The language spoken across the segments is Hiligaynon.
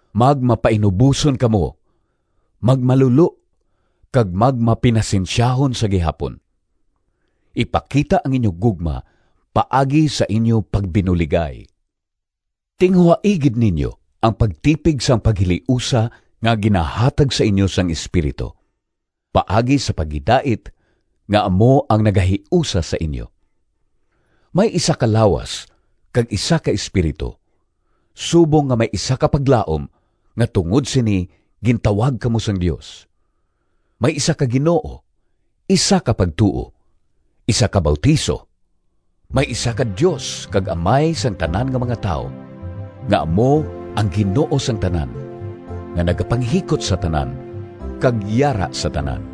Magmapainuboson kamo, magmalulo, kag magmapinasensyahon sa gihapon. Ipakita ang inyo gugma paagi sa inyo pagbinuligay. Tinguhai gid ninyo ang pagtipig sang paghiliusa nga ginahatag sa inyo sang Espiritu, paagi sa paghidait nga amo ang nagahiusa sa inyo. May isa ka lawas kag isa ka Espiritu, subong nga may isa ka paglaom nga tungod sini gintawag kamo sang Dios. May isa ka Ginoo, isa ka pagtuo, isa ka bautiso, may isa ka Dios kag Amay sang tanan nga mga tawo, nga amo ang Ginoo sang tanan, nga nagapanghikot sa tanan, kag yara sa tanan.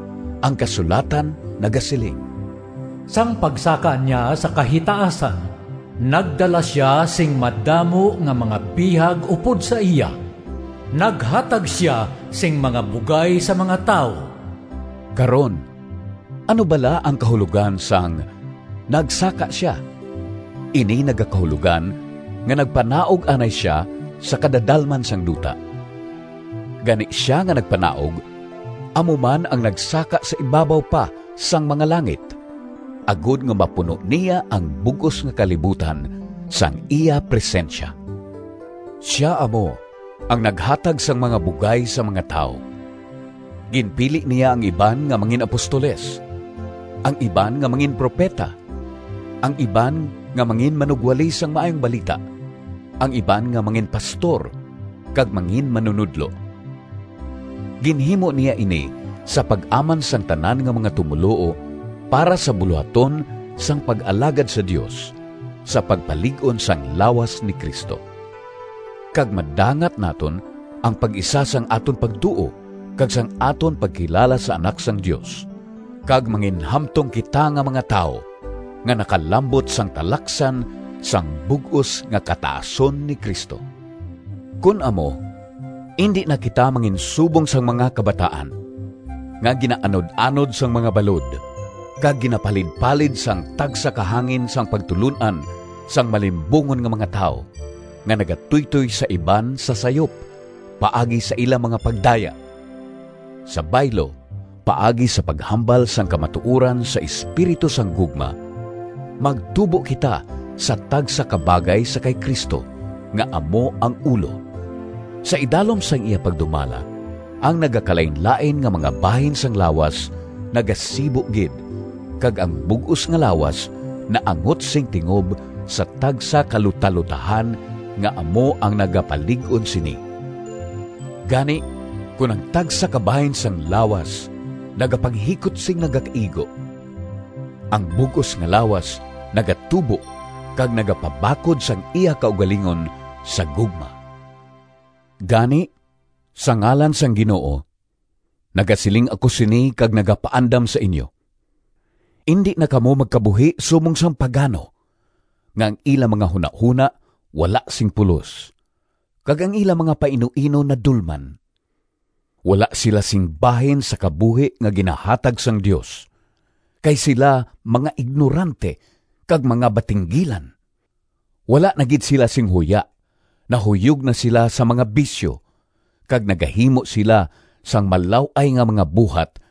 Ang kasulatan nagasiling: “Sang pagsaka niya sa kahitaasan Nagdala sia sing madamo Nga mga bihag upod sa iya. Naghatag sia sing mga bugay Sa mga tawo.” Karon, ano bala ang kahulogan sang “nagsaka sia”? Ini nagakahulogan nga nagpanaog anay sia sa kadadalman sang duta. Gani sia nga nagpanaog amo man ang nagsaka sa ibabaw pa sang mga langit, agod nga mapuno niya ang bug-os nga kalibutan sang iya presensya. Sia amo ang “naghatag sang mga bugay sa mga tawo,” ginpili niya ang iban nga mangin-apostoles, ang iban nga manginpropeta, ang iban nga manginmanugwali sang Maayong Balita, ang iban nga manginpastor kag manginmanunodlo. Ginhimo niya ini sa pag-aman sang tanan nga mga tumoluo para sa bulohaton sang pag-alagad sa Dios, sa pagpalig-on sang lawas ni Cristo. Kag madangat naton ang pag-isa sang aton pagtuo kag sang aton pagkilala sa Anak sang Dios, kag manginhamtong kita nga mga tawo nga nakalambot sang talaksan sang bug-os nga kataason ni Cristo. Kon amo indi na kita manginsubong sang mga kabataan, nga ginaanud-anod sang mga balod, kag ginapalidpalid sang tagsa ka hangin sang pagtulon-an sang malimbungon nga mga tawo, nga nagatuytoy sa iban sa sayop, paagi sa ila mga pagdaya. Sa baylo, paagi sa paghambal sang kamatuoran sa espiritu sang gugma, magtubo kita sa tagsa ka bagay sa kay Cristo, nga amo ang ulo. Sa idalom sang iya pagdumala ang nagakalainlain nga mga bahin sang lawas nagasibo gid, kag ang bug-os nga lawas naangot sing tingob sa tagsa ka lutalotahan nga amo ang nagapalig-on sini. Gani kon ang tagsa ka bahin sang lawas nagapanghikot sing nagakaigo, ang bug-os nga lawas nagatubo kag nagapabakod sang iya kaugalingon sa gugma. Gani, sa ngalan sang Ginoo nagasiling ako sini kag nagapaandam sa inyo: indi na kamo magkabuhi subong sang pagano, nga ang ila mga hunahona wala sing pulos, kag ang ila mga painuino nadulman. Wala sila sing bahin sa kabuhi nga ginahatag sang Dios, kay sila mga ignorante kag mga batinggilan. Wala na gid sila sing huya, nahuyog na sila sa mga bisyo, kag nagahimo sila sang malaw-ay nga mga buhat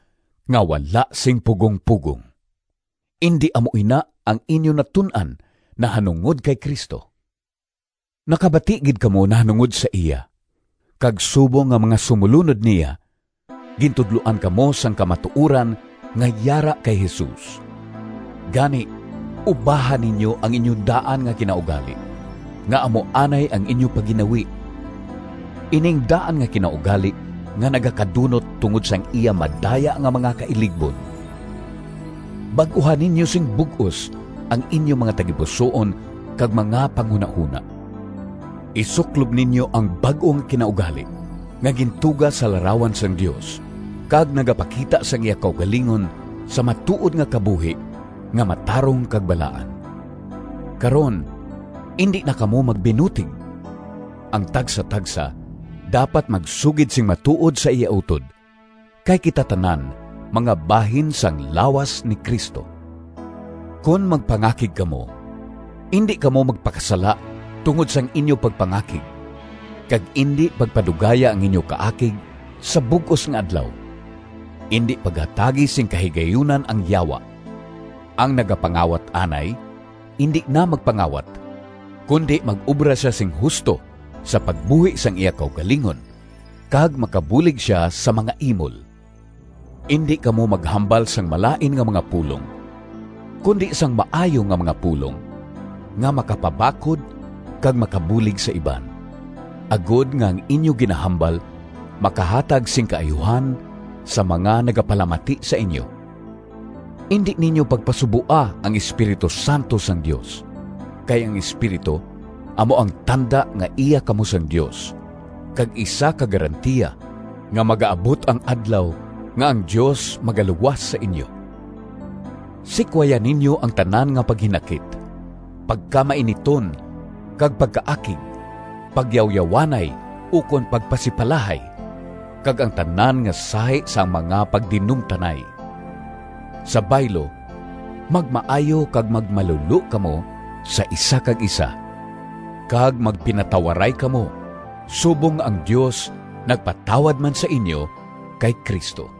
nga wala sing pugongpugong. Indi amo ina ang inyo natun-an nahanungod kay Cristo! Nakabati gid kamo nahanungod sa iya, kag subong nga mga sumolunod niya gintudloan kamo sang kamatuoran nga yara kay Jesus. Gani ubaha ninyo ang inyo daan nga kinaugali, nga amo anay ang inyo pagginawi, ining daan nga kinaugali nga nagakadunot tungod sang iya madaya nga mga kailigbon. Bag-uha ninyo sing bug-os ang inyo mga tagipusoon kag mga panghunahona. Isuklob ninyo ang bag-o nga kinaugali, nga gintuga sa larawan sang Dios, kag nagapakita sang iya kaugalingon sa matuod nga kabuhi nga matarong kag balaan. Karon, indi na kamo magbinutig! Ang tagsatagsa dapat magsugid sing matuod sa iya utod, kay kita tanan mga bahin sang lawas ni Cristo. Kon magpangakig kamo, indi kamo magpakasala tungod sang inyo pagpangakig, kag indi pagpadugaya ang inyo kaakig sa bug-os nga adlaw. Indi paghatagi sing kahigayunan ang Yawa. Ang nagapangawat anay indi na magpangawat, kundi mag-obra sia sing husto sa pagbuhi sang iya kaugalingon, kag makabulig sia sa mga imol. Indi kamo maghambal sang malain nga mga pulong kundi sang maayo nga mga pulong, nga makapabakod kag makabulig sa iban, agod nga ang inyo ginahambal makahatag sing kaayuhan sa mga nagapalamati sa inyo. Indi ninyo pagpasuboa ang Espiritu Santo sang Dios, kay ang Espiritu amo ang tanda nga iya kamo sang Dios, kag isa ka garantiya nga magaabot ang Adlaw nga ang Dios magaluwas sa inyo. Sikwaya ninyo ang tanan nga paghinakit, pagkamainiton kag pagkaakig, pagyawyawanay ukon pagpasipalahay, kag ang tanan nga sahi sang mga pagdinumtanay! Sa baylo, magmaayo kag magmalulo kamo sa isa kag isa, kag magpinatawaray kamo, subong nga ang Dios nagpatawad man sa inyo kay Cristo.